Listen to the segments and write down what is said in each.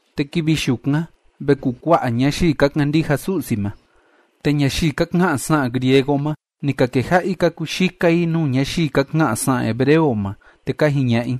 Te kivi yukan ve kukua'a ñayii ka kandija Su'si ma. Te ñayii ka ka'an sa'an griego ma, ni ka keja'a i ka kuyika i nuu ñayii ka ka'an sa'an hebreo ma, te ka jiña'a i: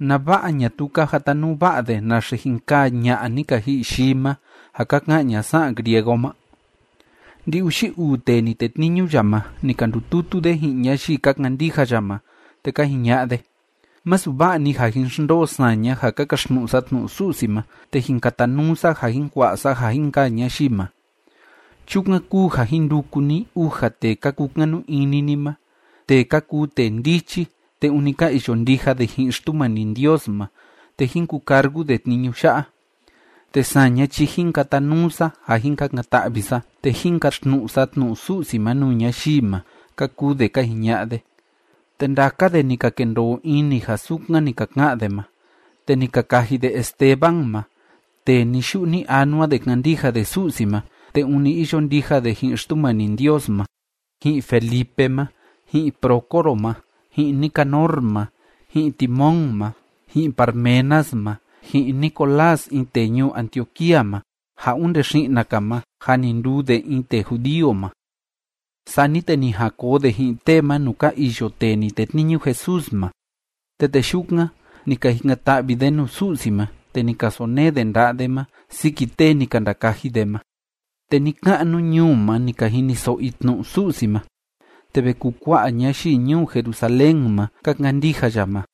“¿Nava'a ñatuu ka jatanuu va'a de naxe jin kaa ña'a ni ka ji'i yii ma ja ka ka'an ña sa'an griego ma?” Ndi‑uxi uu tee ni tetniñu ya ma, ni ka ndututu de ji'in ñayii ka kandija ya ma, te ka jiña'a de: ―Masu va'a‑ni ja jin xndoo saña ja ka kaxtnu'u sa tnu'u Su'si ma, te jin katanuu sa ja jin kua'a sa ja jin kaa ñayii ma. Chukan kúu ja jin nduku ni uja tee ka kukanu ini ni ma, tee ka kuu tee ndichi, te ûni ka iyo ndija de ji'in Xtumani Ndios ma, te jín kucargu de tniñu ya'a. Te saña chi jin katanuu sa ja jin kakan‑ta'vi sa, te jin kaxtnu'u sa tnu'u Su'si ma nuu ñayii ma ―ka kuu de ka jiña'a de. Te ndaka de ni ka kendoo ini ja sukan ni ka ka'an de ma, te ni ka kaji de Esteban ma tee ni‑yu'u ni‑anua de kándija de Su'si ma te ûni iyo ndija de ji'in Xtumani Ndios ma, ji'in Felipe ma, ji'in Prócoro ma, ji'in Nicanor ma, ji'in Timón ma, ji'in Parmenas ma, ji'in Nicolás in tee ñuu Antioquía ma ja onde xi'na‑ka ma jâ ni nduu de in tee judío ma. Sani te ni jan koo de ji'in tee ma nuu ka iyo tee ni tetniñu Jesús ma. Te tee yukan, ni ka jikan‑ta'vi de nuu Su'si ma, te ni ka sonee de nda'a de ma siki tee ni ka ndakaji de ma. Te ni‑ka'nu ñuu ma ni ka jiniso'o i tnu'u Su'si ma, te ve kukua'a ñayii ñuu Jerusalén ma ka kandija ya ma.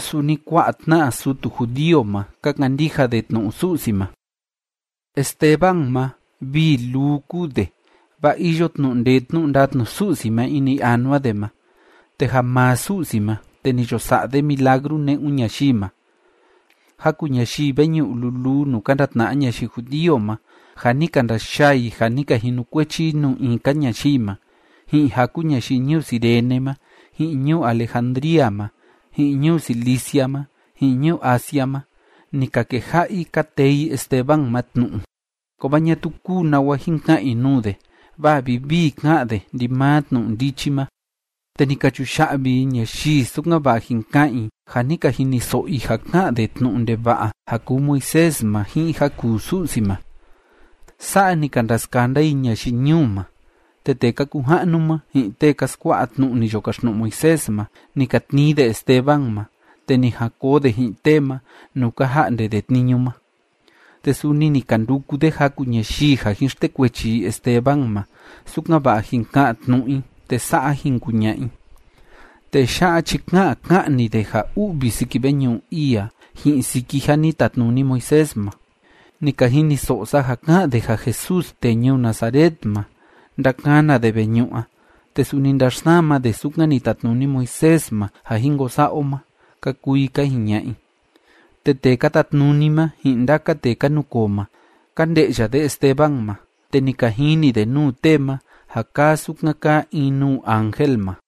Suni kua'a tna'a sutu judío ma, ka kandija de tnu'u Su'si ma. Esteban ma, vii luu kúu de, vaa iyo tnu'u ndee tnu'u ndatnu Su'si ma ini anua de ma, te ja maa Su'si ma, te ni yo sa'a de milagru ne'un ñayii ma. Jaku ñayii veñu'u luluu nuu ka ndatna'a ñayii judío ma ja ni ka ndayaa i ja ni ka jinukuechi i nuu in‑ka ñayii ma, ji'in jaku ñayii ñuu Cirene ma, ji'in ñuu Alejandría ma, ji'in ñuu Cilicia ma, ji'in ñuu Asia ma, ni ka keja'a i ka tee i Esteban ma tnu'u. Kovaa ñatuu kúu nawa jin ka'an i nuu de, vaa vivii ká'an de ndimaa tnu'u ndichi ma. Te ni ka chuya'vi i ñayii, sukan‑va'a jin ka'an i ja ni ka jiniso'o i ja ká'an de tnu'u ndeva'a ja kuu Moisés ma ji'in ja kuu Su'si ma. Sa'a ni ka ndaskanda i ñayii ñuu ma, te tee ka kuu ja'nu ma, ji'in tee ka skua'a tnu'u ni yo kaxtnu'u Moisés ma, ni ka tnii de Esteban ma, te ni jan koo de ji'in tee ma nuu ka ja'nde de tniñu ma. Te suni ni ka nduku de jaku ñayii ja jin xtekuechi i Esteban ma, sukan‑va'a jin ka'an tnu'u i, te sa'a jin kuña'a i: ―Tee ya'a chi ká'an ká'an‑ni de ja u'vi siki veñu'u ii a ji'in siki ja ni tatnuni Moisés ma. Ni ka jiniso'o sa ja ká'an de ja Jesús tee ñuu Nazaret ma, ndakana de veñu'u a, te suni ndaxsama de sukan ni tatnuni Moisés ma ja jin ko sa'a o ma ―ka kuu i ka jiña'a i. Te tee ka tatnuni ma, ji'in ndaka tee ka nukoo ma, ka nde'ya de Esteban ma, te ni ka jini de nuu tee ma, ja kaa sukan kaa in nuu ángel ma.